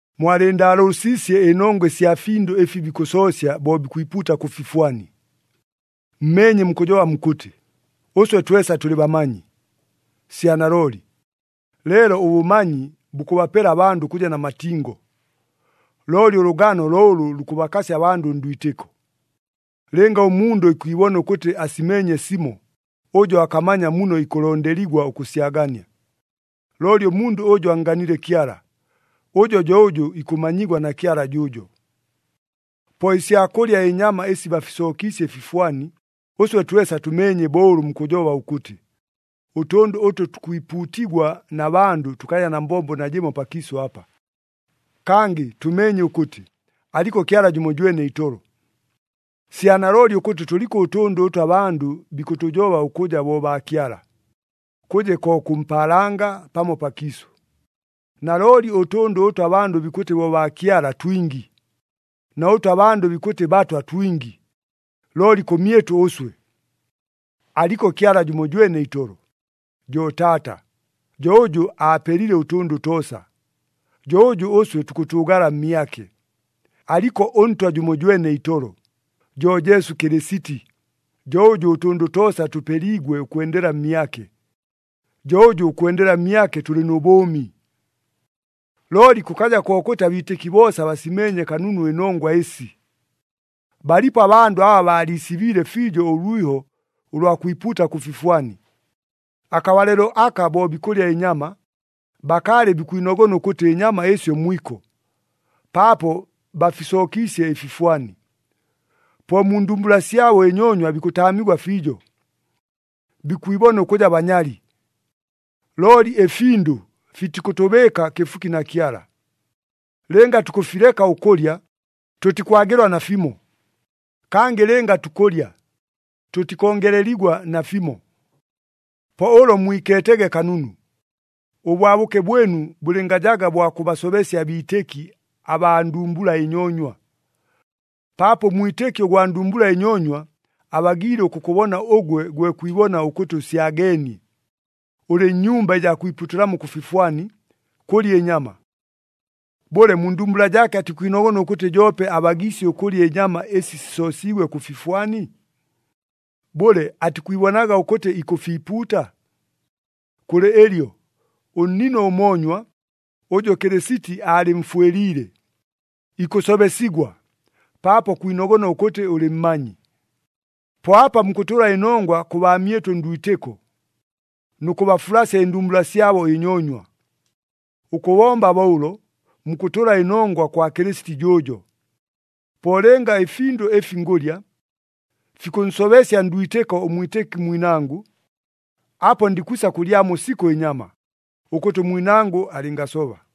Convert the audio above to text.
Mwalɨɨndaalʉʉsiisye ɨnongwa ɨsya findʉ ɨfi bikʉsoosya bo bikwipuuta kʉ fifwani. Mmeenye mukʉjoba mukʉtɨ, “Ʉswe twesa tʉlɨ bamanyi.” Sya nalooli, leelo ʉbʉmanyi bukʉbapela abandʉ ʉkʉja na matingo. Looli ʉlʉgano lo ʉlʉ lukʉbakasya abandʉ ndwitɨko. Lɨnga ʉmundʉ ikwibona ʉkʉtɨ asimeenye simo, ʉjo akamanya muno ikʉlondeligwa ʉkʉsyagania. Looli ʉmundʉ ʉjʉ annganile Kyala, ʉjo jo ʉjʉ ikʉmanyigwa na Kyala jʉʉjo. Po ɨsya kʉlya ɨnyama ɨsi bafisookiisye ɨfifwani, ʉswe twesa tʉmeenye bo ʉlʉ mukʉjoba ʉkʉtɨ, “Ʉtʉndʉ ʉtʉ tukwipuutigwa na bandʉ tʉkaja na mbombo najɨmo pakiisʉ apa.” Kangɨ tʉmeenye ʉkʉtɨ, “Aliko Kyala jʉmojwene itolo.” Sya nalooli ʉkʉtɨ tʉliko ʉtʉndʉ ʉtʉ abandʉ bikʉtʉjoba ʉkʉja bo baakyala, kʉje ko kʉ mpaalanga, pamo pakiisʉ. Nalooli ʉtʉndʉ ʉtʉ abandʉ bikʉtɨ bo baakyala twingi, na ʉtʉ abandʉ bikʉtɨ batwa twingi, looli kʉmyɨtʉ ʉswe, Aliko Kyala jʉmojwene itolo, jo Taata, jo ʉjʉ aapelile ʉtʉndʉ toosa, jo ʉjʉ ʉswe tukʉtʉʉgala mmyake. Aliko ʉNtwa jʉmojwene itolo, jo Jesu Kɨlɨsiti, jo ʉjʉ ʉtʉndʉ toosa tʉpeliigwe ʉkwendela mmyake, jo ʉjʉ ʉkwendela mmyake tʉlɨ nʉ bʉʉmi. Looli kʉkaja kokʉtɨ abiitɨki boosa basimeenye kanunu ɨnongwa ɨsi. Balipo abandʉ aba baaliisibiile fiijo ʉlwiho ʉlwa kwipuuta kʉ fifwani. Akabalɨlo aka bo bikʉlya ɨnyama, bakaalɨ bikwinogona ʉkʉtɨ ɨnyama ɨsyo mwiko, paapo bafisookiisye ɨfifwani. Po mu ndumbula syabo ɨnyoonywa bikʉtaamigwa fiijo, bikwibona ʉkʉja banyali. Looli ɨfindʉ fitikʉtʉbɨɨka kɨfuki na Kyala. Lɨnga tukʉfileka ʉkʉlya, tʉtikwagɨlwa nafimo. Kangɨ lɨnga tukʉlya, tʉtikongeleligwa nafimo. Po ʉlo mwikeetege kanunu, ʉbwabʉke bwɨnu bʉlɨngajaga bwa kʉbasobesya abiitɨki abaa ndumbula ɨnyoonywa. Paapo ʉmwitɨki ʉgwa ndumbula ɨnyoonywa, abagiile ʉkʉkʉbona ʉgwe gwe kwibona ʉkʉtɨ ʉsyageenie, ʉlɨ nnyumba ɨjaa kwipuutɨlamo kʉ fifwani, kʉlya ɨnyama. Bʉle, mu ndumbula jaake atikwinogona ʉkʉtɨ joope abagiisye ʉkʉlya ɨnyama ɨsi sisoosiigwe kʉ fifwani? Bʉle, atikwibonaga ʉkʉtɨ ikʉfiipuuta? Kʉlɨ ɨlyo, ʉnnino ʉmoonywa, ʉjʉ Kɨlɨsiti aalɨmfwɨliile, ikʉsobesigwa, paapo kwinogona ʉkʉtɨ ʉlɨ mmanyi. Po apa mukʉtʉla ɨnongwa kʉ baamyɨnu ndwitɨko, nʉ kʉbafulasya ɨndumbula syabo ɨnyoonywa. Ʉkʉbomba bo ʉlo, mukʉtʉla ɨnongwa kwa Kɨlɨsiti jʉʉjo. Po lɨnga ɨfindʉ ɨfi ngʉlya, fikʉnsobesya ndwitɨko ʉmwitɨki mwinangʉ, apo ndikwisa kʉlyamo sikʉ ɨnyama, ʉkʉtɨ ʉmwinangʉ alɨngasoba.